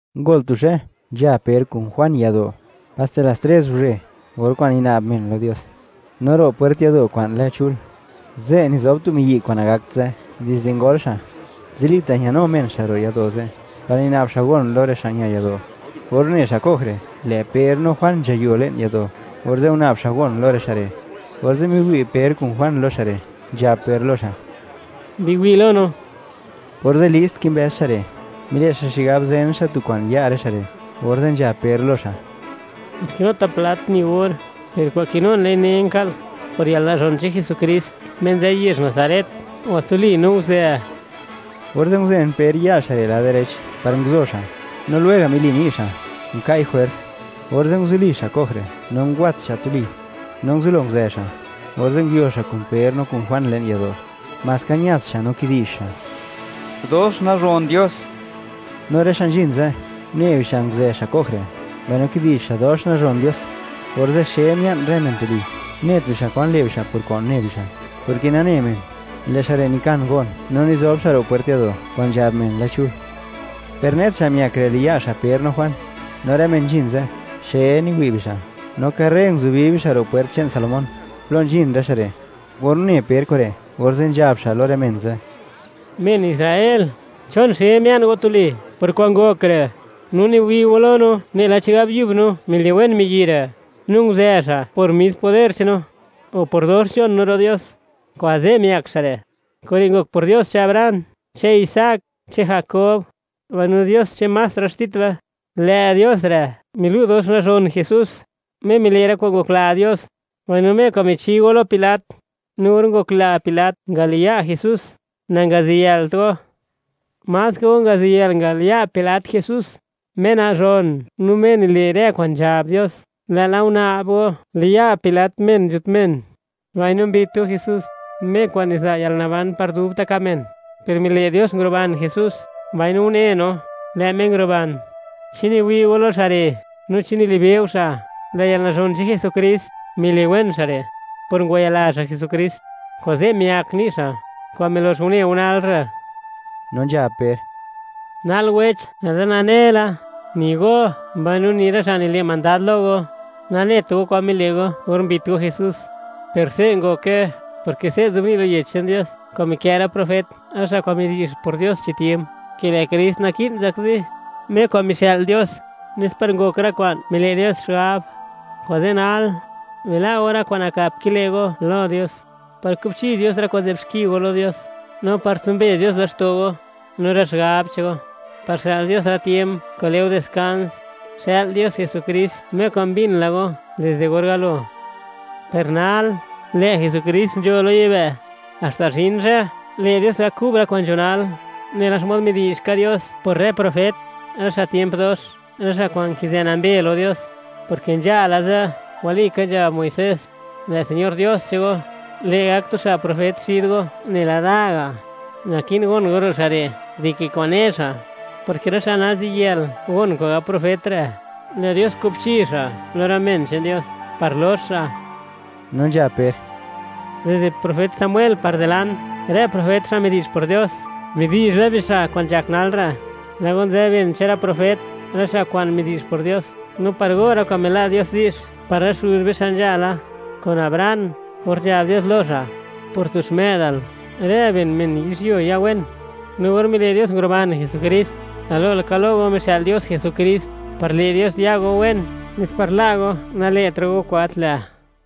Ngol tu zhë, nzha Per kun Juan yado', paste las tres guzhe, or kwa'n nina'b men lo Dios. No ro' pwert yado' kwa'n lë Chul, ze' nizob tu miyi' kwa'n nagakt zë dizde ngol xa'. Zilita' ñanu men xa' ro' yado' ze', par nina'b xa' gon lo rë xa' ña yado'. Or une xa' ko'j re', lë' Per no Juan nzhayo le'n yado', orze' guna'b xa' gon lo rë xa' re'. Orze' miwi' Per kun Juan lo xa' re', nzhab Per lo xa': ―Biwi' lo no. Orze' list kimbëz xa' re', mile' xa' xigab zen xa' tu kwa'n ya' rë xa' re', orze' nzhab Per lo xa': ―Gat kinuta' plat ni or, per kwa'n kinun, lë'i nen ka'l: Por yalnazhon che'n Jesukrist Me nzë yezh Nazaret, ¡ngwatsuli no guzë! Orze' nguzen Per ya' xa' re' lad direch par nguzo xa', no lwega' mili ni' xa', nka'i jwers, orze' nguzuli xa' ko'j re' no ngwats xa' tuli, no nguzublo nguzë xa', orze' nguio xa' kun Per no kun Juan le'n yado'; maska ñats xa', no kidi'zh xa': —¡Dox nazhon Dios! No rë xa' nzhin ze', une bixa' nguzë xa' ko'j re', mbaino kidi'zh xa' dox nazhon Dios. Orze' xe mia'n rë men tuli, net bixa' kwan le' bixa' por kwa'n une bixa', porke nane men, lë' xa' re' nikan gon, no nizob xa' ro' pwert yado' kwa'n nzhab men lë Chul. Per net xa' miak re' liya' xa' Per no Juan, no rë men nzhin ze', xe niwi' bixa', no karre nguzubi bixa' ro' pwert che'n Salomón, plo nzhin rë xa' re'. Or une Per kure', orze' nzhab xa' lo rë men ze': ―Men Israel, ¿chon xe mia'n go tuli por kwa'n ngok re', no niwi' go lo no, nela chigab yub no miliwen miyi' re', no nguzë xa' por mis poder che'n no, o por dox nzhon no ro' Dios, kuze' miak xa' re'? Kure' ngok por Dios che'n Abraham, che'n Isaac, che'n Jakob, mbaino Dios che'n más rë xtit be. Lë' Dios re' milu' dox nazhon Jesús, Me mile' rë kwa'n ngokla Dios, mbaino Me kwa'n michi go lo Pilat. No or ngokla Pilat ngaliya' Jesús, nangaziyëlt go. Maska go ngaziyëlt ngaliya' Pilat Jesús, Me nazhon no Me nile' rë kwa'n nzhab Dios, lë'la guna'b go, liya' Pilat men nzhut men, mbaino mbit go Jesús, Me kwa'n niza' yalnaban par dubta' ka' men, per mile' Dios nguruban Jesús, mbaino une no, lë' Me nguruban. ¿Chi niwi' go lo xa' re', no chi nilibe' go xa'? Lë' yalnazhon che'n Jesukrist miliwen xa' re', por ngwayila xa' Jesukrist. Kuze' miak ni' xa', kwa'n milox une go nal re'. No nzhab Per: ―Nal wech, lë'da nane la; ni go mbaino ni rë xa' nile' mandad lo go, nanet go kwan mile' go or mbit go Jesús. Per se' ngoke, porke se' nzobni' lo Yech che'n Dios kwa'n mikë' rë profet, rë xa' kwa'n midi'zh por Dios chi tiemp, ke lë' Krist naki'n zakzi, Me kwa'n mixë'l Dios, nes par ngok rë kwa'n mile' Dios xigab. Kuze' nal, bila' go rë kwa'n nakap kile' go lo Dios, par kubchi Dios rë kwa'n nzë'b xki go lo Dios, no par tsumbe Dios laxto' go, no rë xigab che'n go, par xë'l Dios rë tiemp kwa'n le' go diskans. Xë'l Dios Jesukrist, Me kwa'n mbin la go dizde or galo. Per nal, lë' Jesukrist nzho lo yibë', haxta zhin zhë, le' Dios gak kub rë kwa'n nzho nal, nela xmod midi'zh ka Dios por rë profet, rë xa' tiemp dox, rë xa' kwa'n nkizë nambe lo Dios, porke nzhala ze', walika nzhab Muisés: “Lë' Señor Dios che'n go, le' gak tu xa' profet xid go, nela da ga'. Naki'n gon go ro' xa' re' dike kwa'n ne xa', porke rë xa' naziyël gon kwa'n gab profet re', lë' Dios kubchi xa' lo rë men che'n Dios, par lox xa'.” No nzhab Per: ―Dizde profet Samuel par dilant, rë profet xa' midi'zh por Dios, midi'zh la bixa' kwa'n nzhak nal re'. Lë' go nzë ben che'n rë profet, rë xa' kwa'n midi'zh por Dios, no par go rë kwa'n mila' Dios di'zh par rë xuz be xa' nzhala, kun Abraham, or nzhab Dios lo xa': “Por tu xmë'dal, rë ben men yizhyuo ya wen.” No or mile' Dios nguruban Jesukrist, galo laka lo go mixë'l Dios Jesukrist, par le' Dios ya go wen, nes par la' go, nale'tra' go kwa'n gat lë'.